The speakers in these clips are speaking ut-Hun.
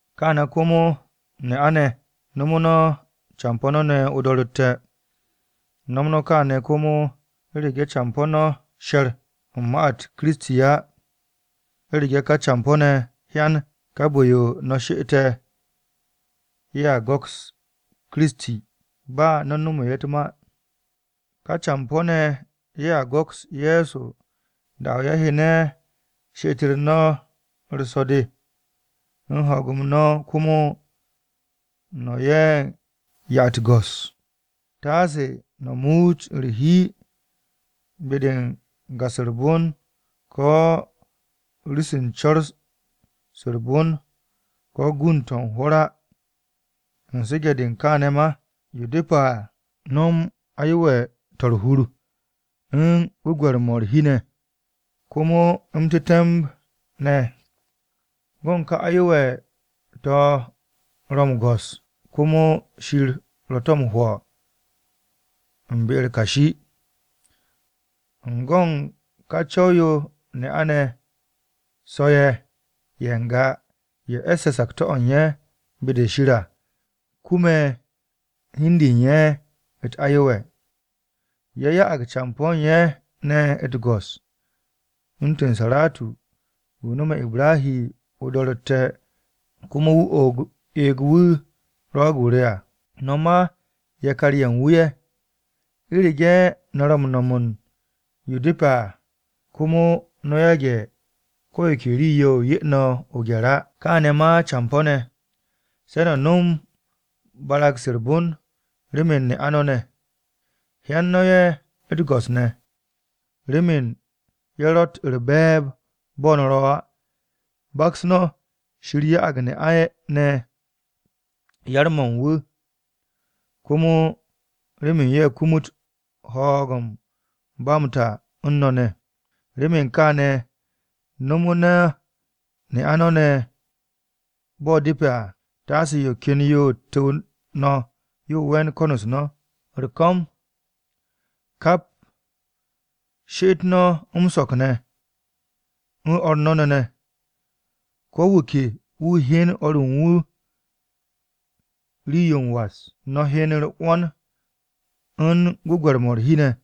Kaane̱ komo ne'a-ne̱, no̱mo̱ no̱ campo̱ no̱ ne̱ o-do̱ro̱tte̱. No̱m no̱ kaane̱ komo u̱rege̱ campo̱ no̱ she̱r u̱n ma-u̱t Kiristi á. U̱rege̱ campo̱ no̱ ne̱ hyanag bon-de u̱n ka bu̱-yo no̱tte̱ u̱r-she'et à, ye̱a go̱ks Kiristi, ba no̱ u̱n nomo ye̱ u̱t-ma. Ka campo̱-ne̱ ye̱a go̱ks Ye̱so da-o̱ ye̱ hyene̱ she'et-u̱r so̱-de u̱n ho̱o̱g-m no̱ komo no̱ 'ye ye̱ u̱t-go̱s. Taase no̱ muut u̱r-hi be-de u̱n ga-se u̱r-bon ko̱ rii-se u̱n co̱r-se u̱r-bon ko̱ gund-to̱ u̱n hwo̱r á. U̱n su̱ge̱-de u̱n kaane̱ ma, yo depe̱ à, no̱m no̱ aye̱we̱-to̱ u̱r-hur u̱n gwu̱gwe̱r-mo̱ u̱r-hi, komo m-tetemb ne̱. Go̱n ka aye̱we̱-to̱ ro̱ m-go̱s, komo Shir ro̱ to̱ m-hwo̱ u̱n be-u̱r kashi. U̱n go̱ u̱n kà co̱w-yo ne'a-ne̱ so̱-ye̱ ye̱ n-ga ye̱ e̱sse̱ sakto̱-o̱ u̱n ye̱ be-de Shir à, kume̱ hi u̱n de u̱n ye̱ u̱t-ayewe̱. Ye̱ ya'ag campo̱ u̱n ye̱ ne̱ u̱t-go̱s. U̱ntu̱n Saratu, wu̱ nome̱ Ibrahi o-do̱ro̱tte̱ komo wu̱ eeg wu̱ “Rwo̱o̱g-o re” à. No̱ ma yakar-ye̱ u̱n wu̱ ye̱, u̱rege̱ no̱ ro̱ m-nom yo depe̱ à komo no̱ yage̱ ko̱ yo ke rii-yo 'ye no̱ o-gye̱r á. Kaane̱ ma campo̱-ne̱, se no̱ nom barag-se u̱r-bon remen ne'a no̱ ne̱. Hyen no̱ ye̱ u̱t-go̱s ne̱, remen ye̱ ro̱tt u̱r-be̱e̱b bo̱ no̱ ro̱ á. Baks no̱, Shir ya'ag ne'a-ne̱ yar-mo̱ u̱n wu̱ komo remen ye̱ kumut ho̱o̱g-m ba m-ta u̱n no̱ ne̱. Remen kaane̱, no̱mu̱ no̱ ne'a no̱ ne̱ bo̱ depe̱ à, taase yo ken yo tu̱w no̱ yo we̱n ko̱n-u̱s no̱. U̱r-ko̱m, kap she'et no̱ m-so̱k ne̱ u̱n o̱r no̱ ne̱ ne̱, ko̱ wu̱ ke wu̱ hyen o̱r u̱n wu̱ rii-yo m-was. No̱ hyen u̱r-'wo̱n u̱n gwu̱gwe̱r-mo̱ u̱r-hi ne̱.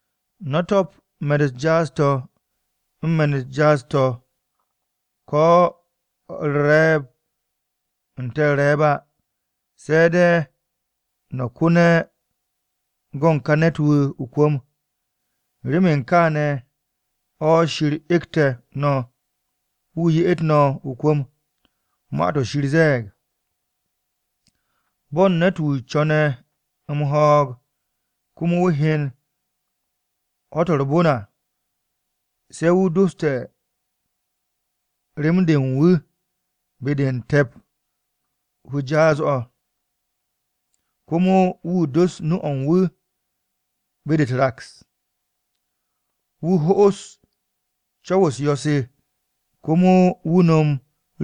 No̱ to̱p me̱n-u̱t jaas-to̱ u̱n me̱n-u̱t jaas-to̱ ko̱ u̱r-re̱e̱b n-te̱ u̱r-re̱e̱b á, se̱ de̱ no̱ ko̱ne̱ go̱ u̱n ká ne̱t-wu̱ o-kwu̱m, remen kááne̱ o̱ Shir egte̱ no̱ wu̱ ye'et no̱ o-kwu̱m. Ma-to̱ Shir ze̱e̱g, “Bo̱n ne̱t-wu̱ co̱ne̱ m-ho̱o̱g komo wu̱ hyen ho̱-to̱ u̱r-bon à, Se̱ wu̱ doste̱ rem-de u̱n wu̱ be-de u̱n te̱p u̱ jaas-o̱ komo wu̱ dos nu-o̱ u̱n wu̱ be-de u̱t-raks. Wu̱ ho'os co̱w-u̱s yo̱-se komo wu̱ nom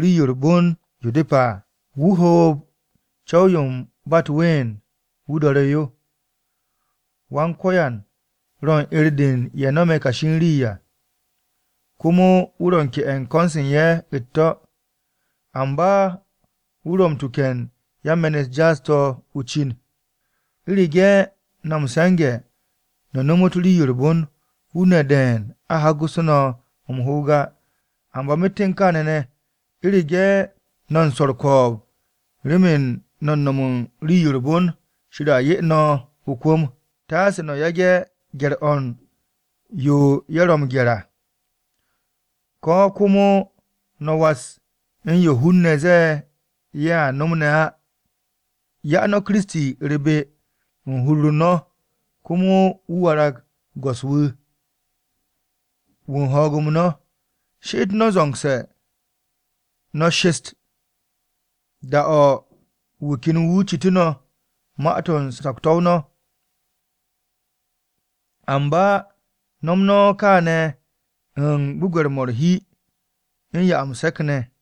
rii-yo u̱r-bon yo depe̱ à. Wu̱ hoob co̱w-yo u̱n ba u̱t-ween wu̱ do̱re̱ yo. Wan-Ko̱yan ro̱ u̱n 'er-de u̱n ye̱ no̱me̱ kashi u̱n rii à, komo wu̱ ro̱ m-ke'e̱ u̱n ko̱n-se u̱n ye̱ u̱t-to̱. Amba wu̱ ro̱ m-tuke̱ u̱n yan-me̱n-u̱t jaas-to̱ o-cin.” U̱rege̱ no̱ m-se̱nge̱ no̱ nomot rii-yo u̱r-bon, hun-ne̱ de̱e̱n a ho̱gu̱sse̱ no̱ m-hoog á. Amba myet u̱n kaane̱ ne̱, u̱rege̱ no̱ u̱n swo̱ u̱r-ko̱o̱b remen no̱ m-no̱m u̱n rii-yo u̱r-bon, Shir a 'ye no̱ o-kwu̱m. “Taase no̱ ho̱ge̱ gye̱r-o̱ u̱n yo ye̱ ro̱ m-gye̱r à, ko̱ komo no̱ was u̱n yo hun-ne̱ ze̱e̱ ye̱a nom ne̱ á.” Ya no̱ Kiristi u̱r-be u̱n hur-u̱r no̱ komo wu̱ warag Go̱s-wu̱ wu̱ u̱n ho̱o̱g-m no̱. She'et no̱ zo̱ngse̱ no̱ shest da-o̱ wu̱ ken wu̱ citu̱ no̱ ma-to̱ u̱n sakto̱-o no̱. Amba no̱m no̱ kaane̱ u̱n gwu̱gwe̱r-mo̱ u̱r-hi u̱n 'ya m-se̱k ne̱.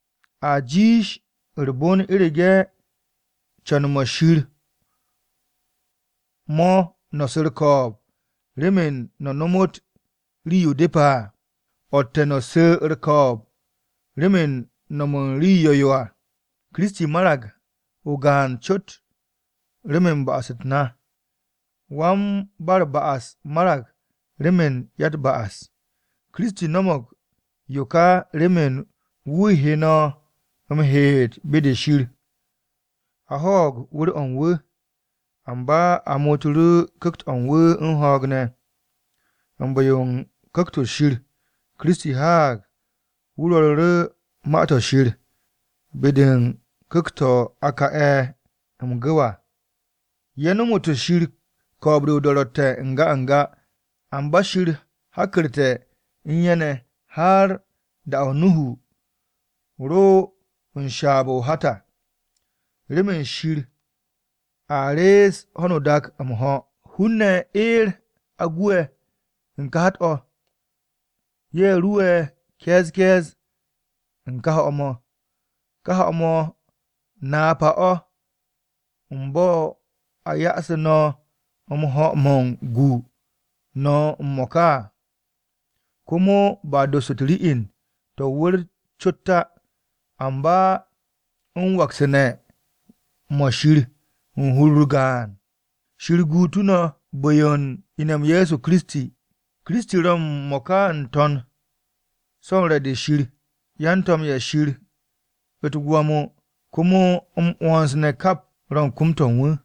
A jiish u̱r-bon u̱rege̱ co̱n-mo̱ Shir mo̱ no̱ su̱ u̱r-ko̱o̱b remen no̱ no̱mo̱g rii-yo depe̱ à o̱tte̱ no̱ su̱ u̱r-ko̱o̱b remen no̱m u̱n rii yo̱-yo à. Kiristi marag o-gaan cot remen ba'as-u̱t na. Wan-ba-u̱r-ba'as marag remen ya-u̱t-ba'as. Kiristi no̱mo̱g yo ka remen wu̱ he no̱ m-heet be-de Shir. A ho̱o̱g wu̱r-o̱ u̱n wu̱, amba a muutu̱ru̱ Ku̱kt-o̱ u̱n wu̱ u̱n ho̱o̱g ne̱. U̱n bu̱-yo Ku̱kt-o̱ ShirKiristi haag wu̱ rwo̱ru̱ru̱ Ma-to̱ Shir be-de u̱n ku̱kt-to̱ a ka'e̱ m-gu̱w à. Ye̱ nomu̱te̱ Shir ko̱o̱b-de o-do̱ro̱tte̱ n-ga n-ga, amba Shir hakku̱rte̱ u̱n ye̱ ne̱ har u̱n da-o̱ Nuhu ro u̱n shaab-o̱ o-hat à, remen Shir a rees ho̱no o-dak m-ho̱. Hun-ne̱ eer a gu'e̱ u̱n ka hat-o̱, ye̱ ruwe̱ ke̱e̱z ke̱e̱z u̱n ka ho̱-mo̱. Ka ho̱-mo̱ napa-o̱ u̱n bo̱ a yo'osu̱ no̱ m-ho̱ mo̱ gu no̱ m-mo̱ka à. Komo ba dos u̱t-ri'in to̱ o-wu̱r cot á, amba u̱n waktu̱ne̱ ne̱ mo̱ Shir u̱n hur-u̱r gaan. Shir guug no̱ u̱n bu̱-yo u̱n ine̱-m Ye̱so Kiristi. Kiristi ro̱ m-mo̱ka n-To̱n, so̱ u̱n re̱-de Shir. Yan-to̱m-ye̱ Shir, u̱t-gwo̱mo, komo m-'wo̱ns ne̱ kap ro̱ u̱n kom-to̱ u̱n wu̱.